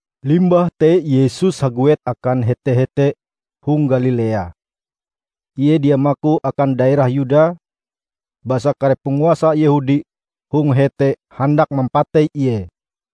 Limbah te Yesus haguet akan hete-hete hong Galilea. Ie dia maku akan daerah Yuda basa kare panguasa Yehudi hong hete handak mampatei Ie.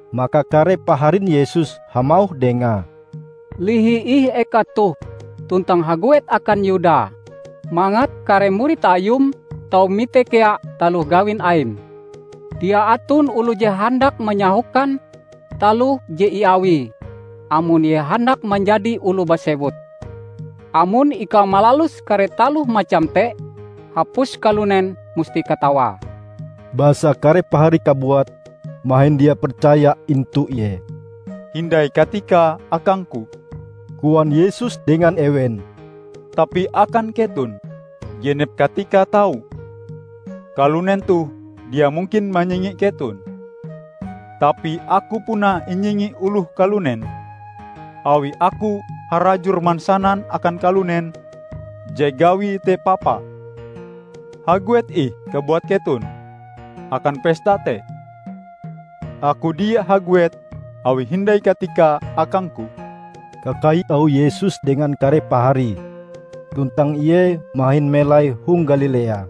Maka kare paharin Yesus hamauh dengae, "Lihi ih eka toh tuntang haguet akan Yuda, mangat kare murid Ayum tau mite kea taloh gawin Aim. Dia aton oloh je handak manyahokan taloh je iawie, amon Ie handak manjadi oloh basewut. Amon ikau malalus kare taloh macam te, hapus kalunen musti katawae!" ( Basa kare paharie kabuat mahin dia percaya intu Ie.) "Hindai katikae akang-Ku," koan Yesus dengan ewen, "tapi akan keton, genep katika tau. Kalunen toh dia mungkin manyingi keton. Tapi Aku puna inyingi oloh kalunen, awi Aku harajur mansanan akan kalunen je gawie te papa. Haguet ih kabuat keton akan pesta te. Aku dia haguet awi hindai katikae akang-Ku." Kakai auh Yesus dengan kare paharie, tuntang Ie mahin melai hong Galilea.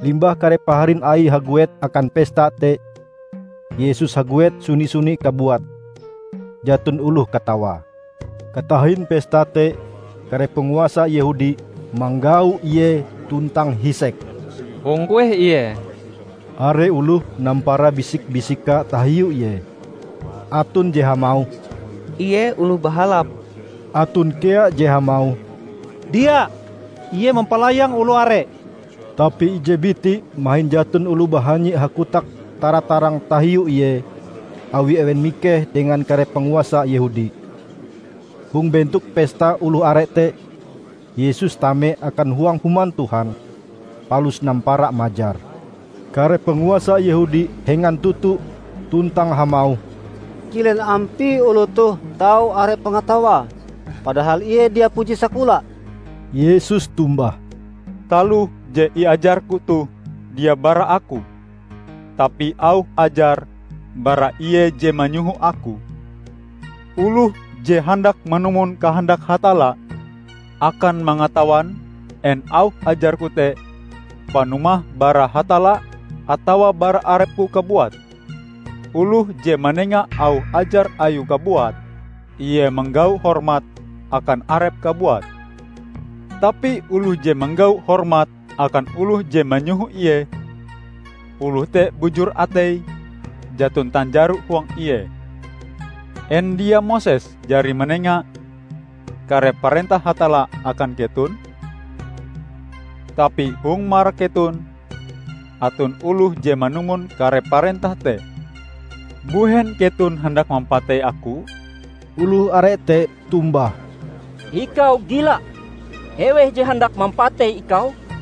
Limbah kare paharin Aie haguet akan pesta te, Yesus haguet suni-suni kabuate, jaton oloh katawae. Katahin pesta te, kare panguasa Yehudi manggau Ie tuntang hisek, "Hong kueh Ie?" Are oloh nampara bisik-bisika tahiu Ie. Aton je hamauh, "Ie oloh bahalap." Aton kea je hamauh, "Dia! Ie mampalayang oloh are." Tapi ije biti mahin jaton oloh bahanyi hakotak tara-tarang tahiu Ie awi ewen mikeh dengan kare panguasa Yehudi. Hong bentok pesta oloh are te, Yesus tame akan huang Human Tuhan, palus nampara majar. Kare panguasa Yehudi hengan toto tuntang hamauh, "Kilen ampie oloh toh tau are pangatawae, padahal Ie dia puji sakola?" Yesus tombah, "Taloh je iajar-Ku toh dia bara Aku tapi auh ajar bara Ie je manyoho Aku. Oloh je handak manumon kahandak Hatalla, akan mangatawan en auh ajar-Ku te panumahe bara Hatalla atawa bara arep-Ku kabuat. Oloh je manenga auh ajar ayue kabuat, ie manggau hormat akan arepe kabuat. Tapi oloh je manggau hormat akan oloh je manyoho ie, oloh te bujur ateie, jaton tanjaro huang ie. En dia Moses jari manenga kare parentah Hatalla akan keton? Tapi hong marak keton aton oloh je manumon kare parentah te. Mbuhen keton handak mampatei Aku?" Oloh are te tombah, "Ikau gila! Eweh je handak mampatei ikau?"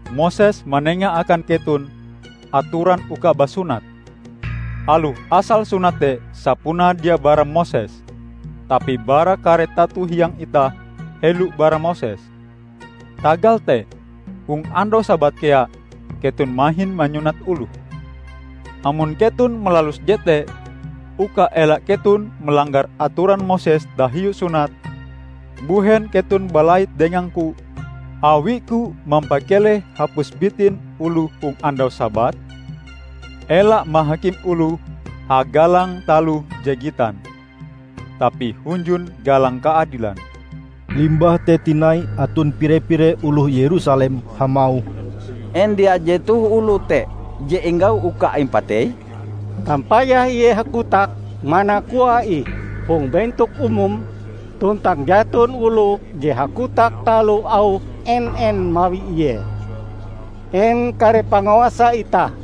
Moses manenga akan keton atoran uka basunat -- aloh asal sunat te sapunae dia bara Moses, tapi bara kare tato hiang itah helo bara Moses. Tagal te, hong andau Sabat kea keton mahin manyunat oloh. Amon keton malalus jete uka ela keton malanggar atoran Moses tahiu sunat, mbuhen keton balait dengang-Ku awi-Ku mampakeleh hapus bitin oloh hong andau Sabat? Ela mahakim oloh hagalang taloh je gitan, tapi hunjun galang kaadilan." Limbah te tinai aton pire-pire oloh Yerusalem hamauh, "En dia jetoh oloe te je inggau uka impatei? Tampayah Ie hakotak mana koae ih hong bentok umum, tuntang jaton oloh je hakotak taloh auh en-en mawi Ie! En kare panguasa itah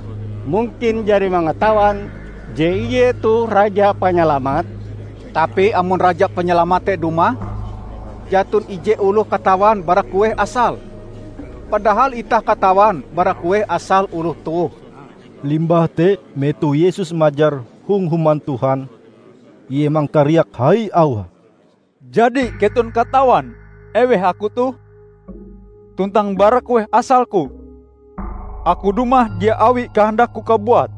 mungkin jari mangatawan je Ie toh Raja Panyalamat? Tapi amon Raja Panyalamat te dumah, jaton ije oloh katawan bara kueh asale! Padahal itah katawan bara kueh asale oloh toh." Limbah te, metoh Yesus majar hong Human Tuhan, Ie mangkariak hai auhe, "Jadi keton katawan eweh Aku toh, tuntang bara kueh asal-Ku? Aku dumah dia awi kahandak-Ku kabuat.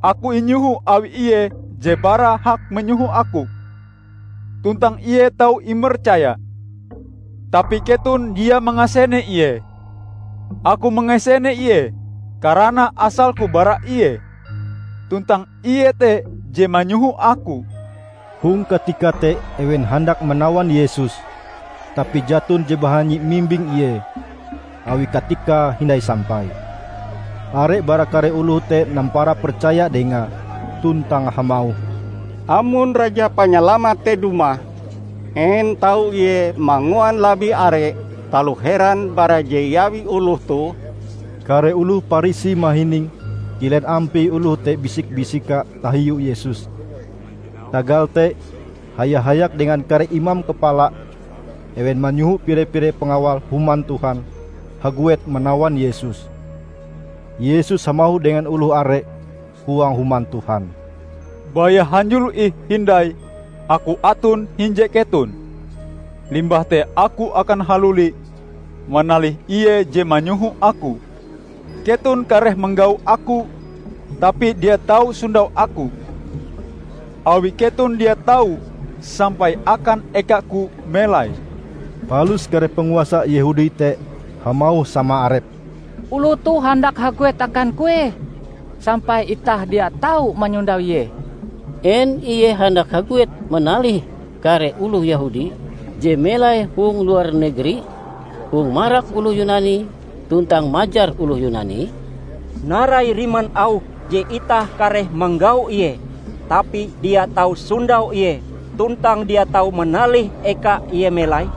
Aku inyoho awi Ie je bara hak manyoho Aku, tuntang Ie tau imercaya. Tapi keton dia mangasene Ie. Aku mangasene Ie, karana asal-Ku bara Ie, tuntang Ie te je manyoho Aku." Hong katika te ewen handak manawan Yesus, tapi jaton je bahanyi mimbing Ie, awi katikae hindai sampai. Are bara kare oloh te nampara percaya dengae, tuntang hamauh, "Amon Raja Panyalamat te dumah, en tau Ie manguan labih are taloh heran bara je iawi oloh toh?" Kare oloh Parisi mahining kilen ampie oloh te bisik-bisika tahiu Yesus. Tagal te, haya-hayak dengan kare imam kapala, ewen manyoho pire-pire pangawal Human Tuhan haguet manawan Yesus. Yesus hamauh dengan oloh are huang Human Tuhan, "Baya hanjulo ih hindai Aku aton hinje keton. Limbah te Aku akan haluli manalih Ie je manyoho Aku. Keton kareh manggau Aku, tapi dia tau sondau Aku; awi keton dia tau sampai akan eka-Ku melai." Palus kare panguasa Yehudi te hamauh sama arepe, "Oloh toh handak haguet akan kueh sampai itah dia tau manyondau Ie? En Ie handak haguet manalih kare oloh Yehudi je melai hong luar negeri hong marak oloh Yunani, tuntang majar oloh Yunani? Narai riman auhe je itah kareh manggau Ie tapi dia tau sondau Ie tuntang dia tau manalih eka Ie melai?"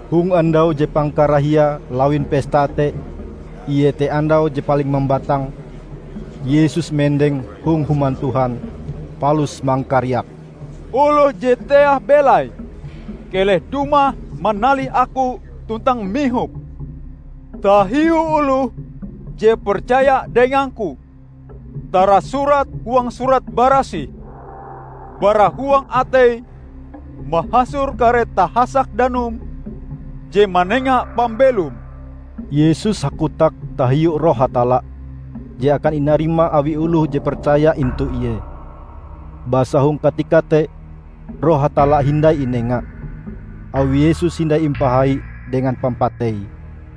Hong andau je pangkarahiae lawin pesta te, iete andau je paling mambatang, Yesus mendeng hong Human Tuhan palus mangkariak, "Oloh je teah belaie keleh dumah manalih Aku tuntang mihop. Tahiu oloh je percaya dengang-Ku, tarasurat huang Surat Barasih, 'Bara huang atei mahasor kare tahasak danum je manenga pambelom.' " ( Yesus hakotak tahiu Roh Hatalla, je akan inarima awi oloh je percaya intu Ie. Basa hong katika te Roh Hatalla hindai inenga; awi Yesus hindai impahai dengan pampateie.)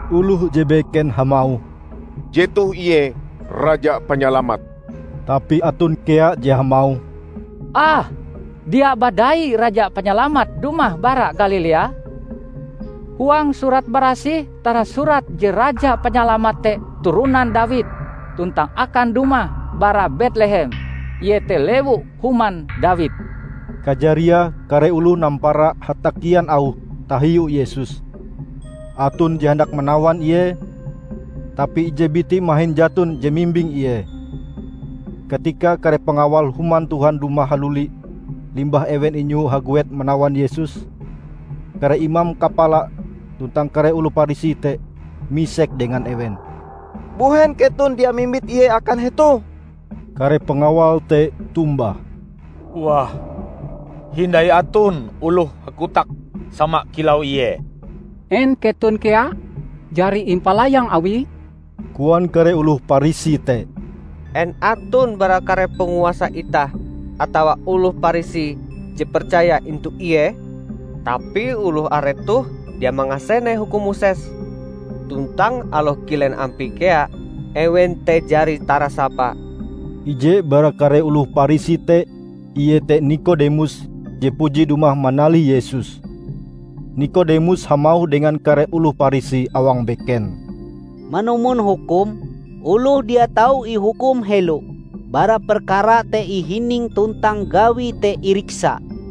Oloh je beken hamauh, "Jetoh Ie Raja Panyalamat!" Tapi aton kea je hamauh, "Ah, dia badai Raja Panyalamat dumah bara Galilea? Huang Surat Barasih tarasurat je Raja Panyalamat te turonan Dawid tuntang akan dumah bara Betlehem, iete lewu-human Dawid." Kajariae kare oloh nampara hatakian auh tahiu Yesus. Aton je handak manawan Ie, tapi ije biti mahin jaton je mimbing Ie. Katika kare pangawal Human Tuhan dumah haluli limbah ewen inyoho haguet manawan Yesus, kare imam kapala tuntang kare oloh Parisi te misek dengan ewen, "Mbuhen keton dia mimbit Ie akan hetoh?" Kare pangawal te tombah, "Wah, hindai aton oloh hakotak sama kilau Ie!" "En keton kea jari impalayang awie?" koan kare oloh Parisi te. "En aton bara kare panguasa itah atawa oloh Parisi je percaya intu Ie? Tapi oloh are toh dia mangasene hukum Moses, tuntang aloh kilen ampie kea ewen te jari tarasapa." Ije bara kare oloh Parisi te iete Nikodemus je puji dumah manalih Yesus. Nikodemus hamauh dengan kare oloh Parisi awang beken, "Manumon hukum, oloh dia tau ihukum helo bara perkarae te ihining tuntang gawie te iriksa."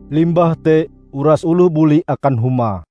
Limbah te uras oloh buli akan huma.